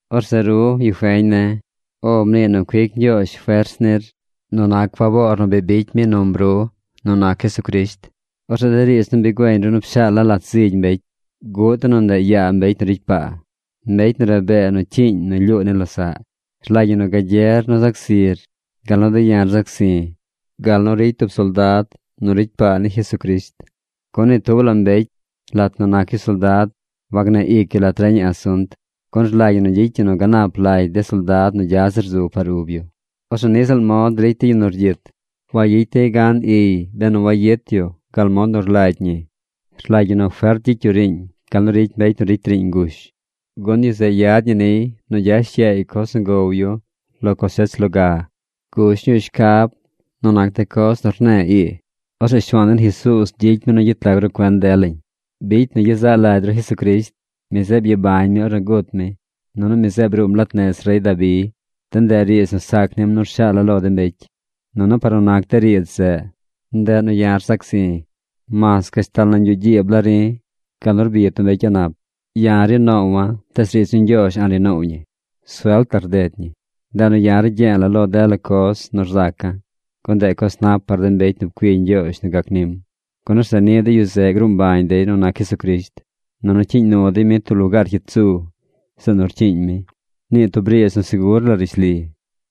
Orzeꞌ ru, yu feñ ne̱, “O” mnii nu cuic Ñgyoozh fers nir nu nac faboor nu bi bicy mi num ru nu nac Jesucrisht. Orzeꞌ de riidz nu bi güeñ ru nu pshaala̱ lat zigy de mbecy, bguꞌ de nu ndeꞌ yaa mbecy nu ricy paa, mbecy nu rabee nu cyiiñ nu lyuu ni losaꞌ. Rlagy ñi nu gagyer nu zac zir gal nu de̱ ya̱ rzac zi̱ gal nu ricy tub soldad nu ricy paa ni Jesucrisht. Gun ni tub la mbecy, lat nu nac yu soldad, wagneꞌ ic yu lat reñaꞌ asunt, gun rlagy ñi nu gyicy yu nu ganap lagy de soldad nu gya zir zu par ub yu. Orzeꞌ niꞌ ziꞌl mod ricy de yu nu rgyit. Wayicy dey gan iy benu wayit yu gal mod nu rlagy ñi. Rlagy ñi nu fert gyicy ru riiñ gal nu ricy mbecy nu ricy riiñ ngush, gun yu zeꞌ yad ñi niy nu gyash yaay coz nu gow yu lo cosech loga. Gush ñuu shcab nu nac de coz nu rne̱e̱ ii. Orzeꞌ Shuaan den Jesuuz gyicy mi nu gyet lag ru cuen delañ. Bicy nu gyezaꞌ lagy ru Jesucrisht. Mi zeꞌ byabañ mi ornu gut mi. Nunu mi zeꞌ bruum lat nez rey Dabi. De ndeꞌ riidz nu sac nim nu rshaala̱ lo de mbecy. Nunu par nu nac de riidz zeꞌ, ndeꞌ nu ya̱ rzac zi̱. Mas gashtal nañ yuꞌ gyiib la ri̱ gal nu rbi tub mbecy a̱ꞌ nap. Ya̱ ri noowa̱, tees riidz ni Ñgyoozh a̱ꞌ ri noow ñi. Suelt la rded ñi. Ndeꞌ nu ya̱ ragye̱e̱ lo dela coz nu rzaca̱, gun ndeꞌ coz nap par de mbecy nu pcui Ñgyoozh nu gac nim, gun orzeꞌ niꞌ de yu zeꞌ gruu mbañ dey nu nac Jesucrisht, nunu cyiiñ nu dey mi tub la lugaar cyit zu, zeꞌ nu rcyiiñ mi. Nii tub riidz nu segur la rishli: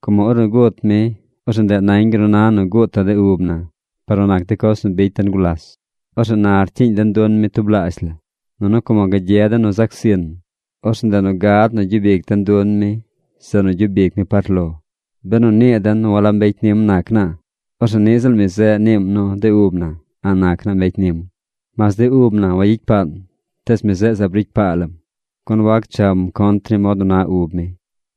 Como ornu gut mi, orzeꞌ ndeꞌ nañ gal nu na nu gutaꞌ de ub na par nu nac de coz nu bicy den gulas. Orzeꞌ na rcyiiñ den dun mi tublaazh la. Nunu como gagye den nu zac zin, orzeꞌ ndeꞌ nu gad nu gyub ic den dun mi zeꞌ nu gyub ic mi par lo. Benu nii den nu walab mbecy nim nac naa, orzeꞌ niꞌ ziꞌl mi zeꞌ niim nu de ub na a̱ꞌ nac naa mbecy nim. Mas de ub na wagyicy paan, tees mi zeꞌ zaab ricy paa lam, gun wac cham contr ni mod nu na ub mi.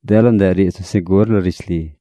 Dela ndeꞌ riidz nu segur la rishli.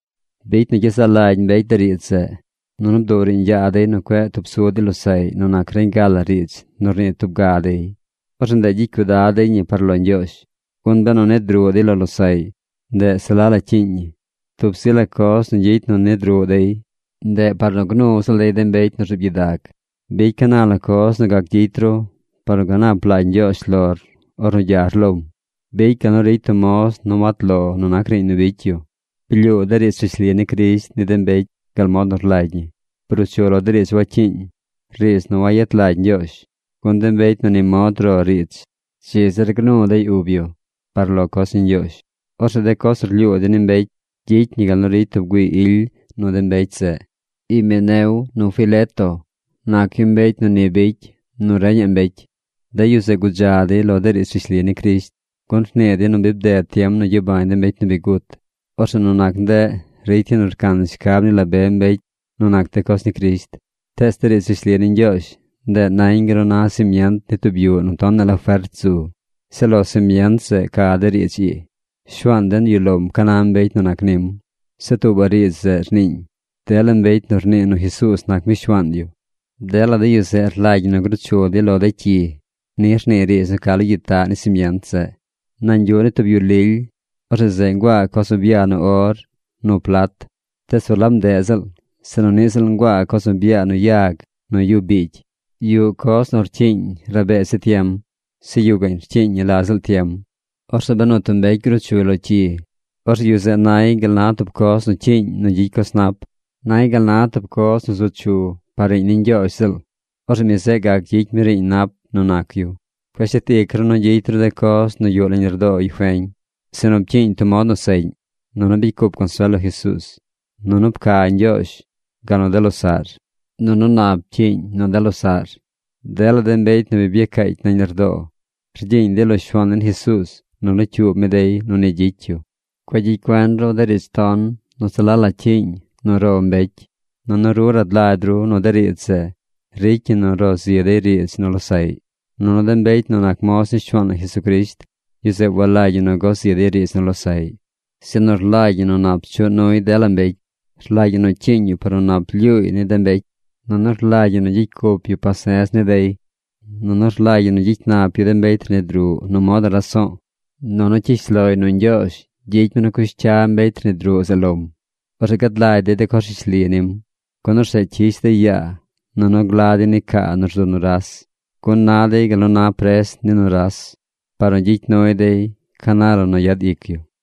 Bicy nu gyezaꞌ lagy mbecy de riidz zeꞌ. Nunu bduꞌ riiñ yaa dey nu cueꞌ tub su dey losaꞌy nu nac reñ ga la riidz nu rnii tub ga dey. Orzeꞌ ndeꞌ gyicy cuidad dey ñi par lo Ñgyoozh. Gun benu nid ruꞌ dey lo losaꞌy, ndeꞌ se la la cyiiñ ñi. Tub zi la coz nu gyicy nu rnid ruꞌ dey, ndeꞌ par nu gnu ziꞌl dey de mbecy nu rzuub gyidag. Bicy ca na la coz nu gac gyicy ru par nu ganap lagy Ñgyoozh lor ornu gyar lom. Bicy gal nu ricy tub moz nu wat lo nu nac riiñ nu bicy yu. Blyuu de riidz rishli ni Crisht ni de mbecy gal mod nu rlagy ñi. Bruu chu lo de riidz wacyiiñ, riidz nu wayet lagy Ñgyoozh, gun de mbecy nu ni mod ro riidz dzi zir gnu dey ub yu par lo coz ni Ñgyoozh. Orzeꞌ de coz nu rlyuu dey ni mbecy gyicy ñi gal nu ricy tub güii ily nu de mbecy zeꞌ. Himeneo nu Fileto nac yu mbecy nu ni bicy nu reñaꞌ mbecy. De yu zeꞌ gudza dey lo de riidz rishli ni Crisht, gun rnii dey nu bi bded tiem nu gyabañ de mbecy nu bi gut. Orzeꞌ nu nac ndeꞌ ricy dey nu rcan shcab ni la be mbecy nu nac de coz ni Crisht. Tees de riidz rishli ni Ñgyoozh, ndeꞌ nañ gal nu na simient ni tub yuꞌ nu tonaꞌ la fert zu. Zeꞌ lo simient zeꞌ ca de riidz ii: “Shuaan den yuꞌ lom ca na mbecy nu nac nim.” Zeꞌ tuubaꞌ riidz zeꞌ rniiñ: “Dela mbecy nu rnii nu Jesuuz nac mi Shuaan yu, dela de yu zeꞌ rlagy ñi nu gruu chu dey lo de cyi.” Ni rnii riidz nu ca lo gyitaꞌ ni simient zeꞌ. Nañ yuꞌ ni tub yu lily, orzeꞌ zeꞌ nguaa coz nu byaa nu or nu plat. Tees walab ndeꞌ ziꞌl, sinu niꞌ ziꞌl nguaa coz nu byaa nu yag nu yu biigy. Yuꞌ coz nu rcyiiñ rabee zi tiem. Zeꞌ yuꞌ gaꞌñ rcyiiñ ñi la ziꞌl tiem. Orzeꞌ benu tub mbecy gruu chuy lo cyi, orzeꞌ yu zeꞌ nay gal na tub coz nu cyiiñ nu gyicy coz nap. Nay gal na tub coz nu zu chu par riiñ ni Ñgyoozh ziꞌl. Orzeꞌ mi zeꞌ gac gyicy mi riiñ nap nu nac yu. Cueꞌ shet ic ru nu gyicy ru de coz nu yuꞌ nañ lardoo yu feñ, sinu pcyiiñ tub mod nu seꞌñ, nunu bicy cup consuel lo Jesuuz, nunu pca Ñgyoozh gal nu de losaꞌr, nunu nap pcyiiñ nu de losaꞌr. Dela de mbecy nu bi byacaacy nañ lardoo, rgyiiñ dey lo Shuaan den Jesuuz nu locyuub mi dey nu ni gyicy yu. Cueꞌ gyicy cuen ru de riidz ton nu se la la cyiiñ nu ro mbecy. Nunu ru rad lagy ru nu de riidz zeꞌ ricy ñi nu ro zi dey riidz nu losaꞌy. Nunu de mbecy nu nac moz ni Shuaan na Jesucrisht, yu zeꞌ walagy ñi nu go zi dey riidz nu losaꞌy, sinu rlagy ñi nu nap chuꞌ nuy dela mbecy. Rlagy ñi nu cyiiñ yu par nu nap lyuuy ni de mbecy. Nunu rlagy ñi nu gyicy cup yu pase̱z ni dey. Nunu rlagy ñi nu gyicy nap yu de mbecy rnid ruꞌ nu mod raso̱o̱, nunu cyish loy nu Ñgyoozh gyicy mi nu cush cya mbecy rnid ruꞌ zeꞌ lom. Orzeꞌ gad lagy dey de coz rishli nim. Gun orzeꞌ cyish dey yaa nunu gla dey ni caa nu rzu nuras. Gun na dey gal nu na pres ni nuras, par nu gyicy nuy dey ca na la nu yad ic yu.